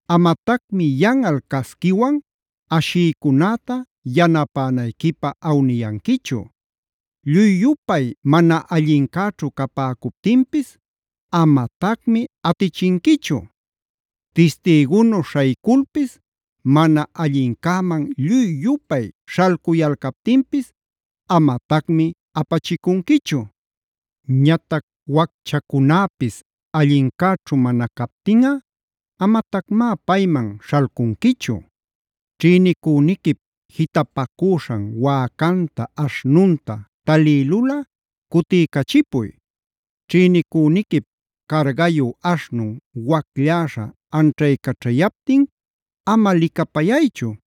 Amatacmi yanꞌal casquiwan ashïcunäta yanapänayquipä awniyanquichu. “Lluy-yupay mana allincäćhu capäcuptinpis amatacmi atichinquichu. Tistïgunu śhayculpis mana allincäman lluy-yupay śhalcuyalcaptinpis amatacmi apachicunquichu. Ñatac wacchacunäpis allincäćhu mana captinꞌa amatacmá payman śhalcunquichu.b “Ćhïnicüniquip jitapacüśhan wäcanta, aśhnunta talïlulꞌa cutiycachipuy. Ćhïnicüniquip cargayu aśhnun waclläśha anćhaycaćhayaptin ama licapayaychu,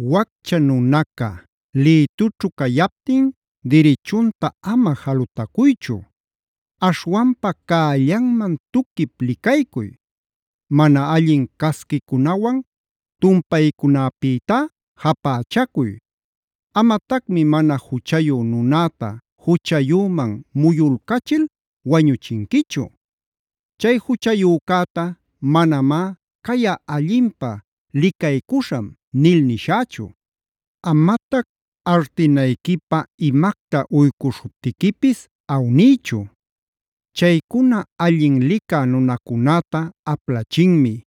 “Waccha nunaca lïtućhu cayaptin dirichunta ama jalutacuychu. Aśhwanpa cällanman tuquip licaycuy. Mana allin casquicunawan tumpaycunäpïtá japächacuy. Amatacmi mana juchayu nunäta juchayüman muyulcachil wañuchinquichu. Chay juchayücäta manamá: ‘Cayꞌa allinpä licaycuśham’ nil nishächu. “Amatac artinayquipä imacta uycuśhuptiquipis awniychu. Chaycuna allin licä nunacunäta aplachinmi;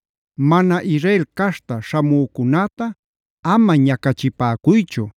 “Mana Israel caśhta śhamücunäta ama ñacachipäcuychu,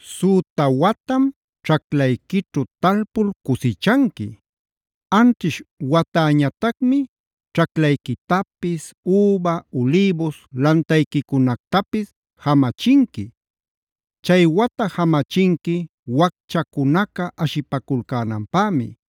“Süta watam ćhaclayquićhu talpul cusichanqui. Anćhish watäñatacmi ćhaclayquitapis, üba, ulïbus lantayquicunactapis jamachinqui. Chay wata jamachinqui wacchacunaca ashipaculcänanpämi;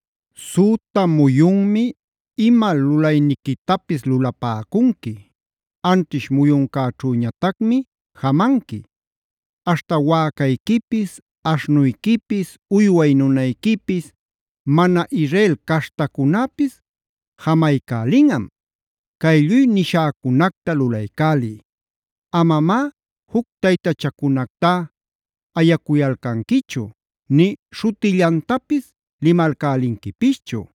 “Süta muyunmi ima lulayniquitapis lulapäcunqui. Anćhish muyuncäćhüñatacmi jamanqui;g aśhta wäcayquipis, aśhnuyquipis, uyway nunayquipis, mana Israel caśhtacunäpis jamaycälinꞌam. “Cay lluy nishäcunacta lulaycäliy. Amamá juc taytachacunactá ayacuyalcanquichu nï śhutillantapis limalcälinquipischu.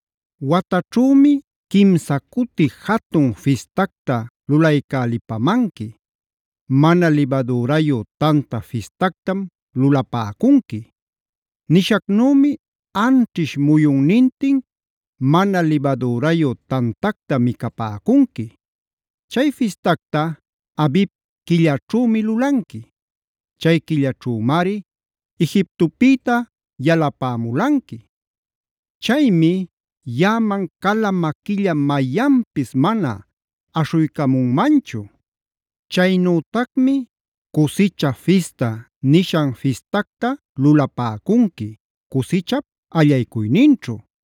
“Wataćhümi quimsa cuti jatun fistacta lulaycälipamanqui. Mana Libadürayu Tanta Fistactam lulapäcunqui. Nishacnümi anćhish muyunnintin Mana Libadürayu tantacta micapäcunqui.h Chay fistacta Abib quillaćhümi lulanqui. Chay quillachümari Egiptopïta yalapämulanqui. Chaymi yaꞌaman cala maquilla mayanpis mana aśhuycamunmanchu. “Chaynütacmi ‘Cusicha Fista’ nishan fistacta lulapäcunqui cusichap allaycuyninćhu.i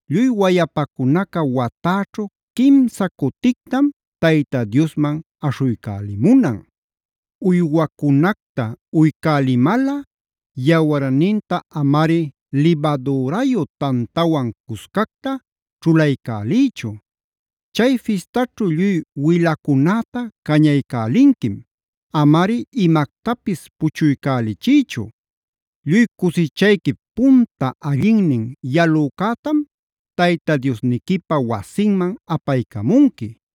“Lluy wayapacunaca watäćhu quimsa cutictam Tayta Diosman aśhuycälimunan. “Uywacunacta uycälimalꞌa yawarninta amari libadürayu tantawan cuscacta ćhulaycäliychu. Chay fistaćhu lluy wilacunäta cañaycälinquim; amari imactapis puchuycälichiychu. “Lluy cusichayquip punta allinnin yalücätam Tayta Diosniquipa wasinman apaycamunqui.k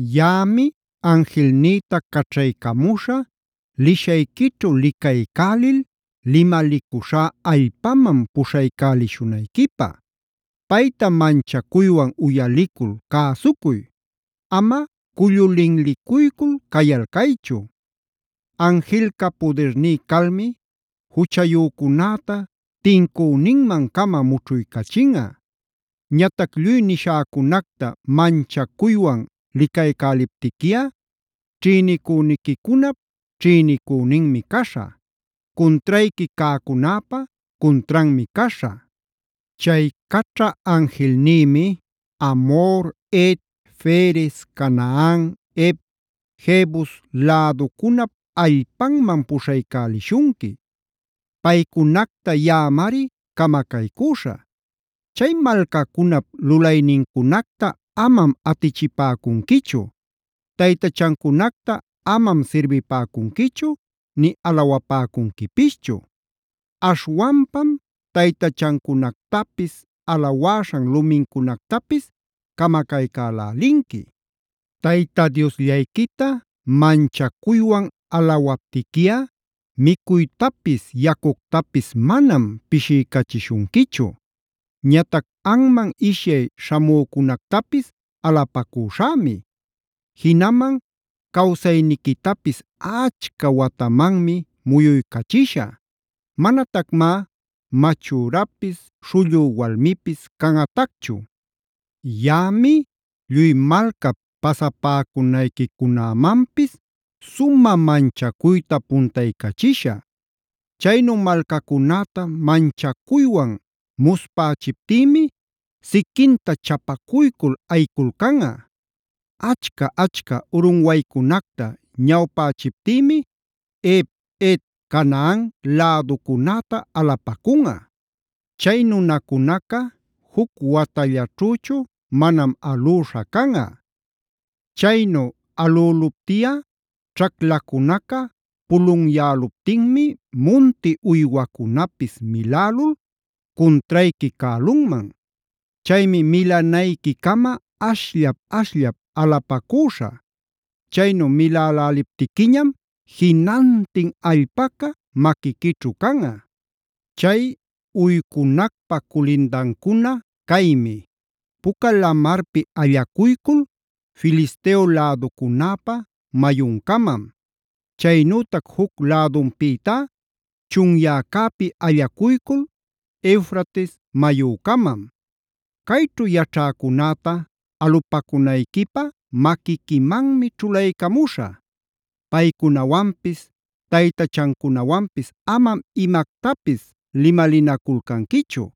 “Yaꞌami anjilnïta caćhaycamuśhä lishayquićhu licaycälil limalicuśhá allpaman puśhaycälishunayquipä. Payta manchacuywan uyalicul cäsucuy. Ama cullu linlicuycul cayalcaychu. Anjilca pudirní calmi juchayücunäta tincüninman-cama mućhuycachinꞌa. Ñatac lluy nishäcunacta manchacuywan lulaycäliptiquiꞌa ćhïnicüniquicunap ćhïnicüninmi caśhä; cuntrayqui cäcunäpa cuntranmi caśhä. Chay caćha anjilnïmi Amhor, Het, Ferez, Canaan, Hev, Jebus läducunap allpanman puśhaycälishunqui. Paycunacta yaꞌamari camacaycüśhä. Chay malcacunap lulaynincunacta amam atichipäcunquichu; taytachancunacta amam sirbipäcunquichu nï alawapäcunquipischu. Aśhwanpam taytachancunactapis, alawäśhan lumincunactapis camacaycälälinqui. Tayta Diosllayquita manchacuywan alawaptiquiꞌa micuytapis yacuctapis manam pishiycachishunquichu. “Ñatac anman ishyay śhamücunactapis alapacuśhämi. Jinaman cawsayniquitapis achca watamanmi muyuycachishä. Manatacmá machürapis, śhullü walmipis canꞌatacchu. “Yaꞌami lluy malcap pasapäcunayquicunämanpis sumä manchacuyta puntaycachishä. Chaynu malcacunäta manchacuywan muspächiptïmi siquinta chapacuycul ayiculcanꞌa. Achca-achca urunwaycunacta ñawpächiptïmi Hev, Het, Canaan läducunäta alapacunꞌa. Chay nunacunaca juc watallaćhüchu manam alüśha canꞌa. Chaynu alüluptiꞌa ćhaclacunaca pulunyäluptinmi munti uywacunapis milälul cuntrayqui cälunman. Chaymi milanayquicama ashllap-ashllap alapacüśhä. Chaynu miläläliptiquiñam jinantin allpaca maquiquićhu canꞌa. “Chay uycunacpä culindancuna caymi: Puca Lamarpi allacuycul Filisteo läducunäpa mayuncamam. Chaynütac juc lädunpïtá chunyäcäpi allacuycul Eufrates mayücamam. Cayćhu yaćhäcunäta alupäcunayquipä maquiquimanmi ćhulaycamuśhä. “Paycunawanpis taytachancunawanpis amam imactapis limalinaculcanquichu.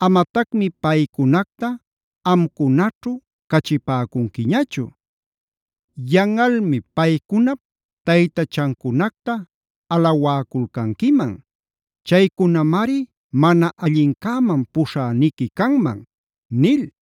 Amatacmi paycunacta amcunaćhu cachipäcunquiñachu. Yanꞌalmi paycunap taytachancunacta alawäculcanquiman. Chaycunamari mana allincäman puśhäniqui canman” nil.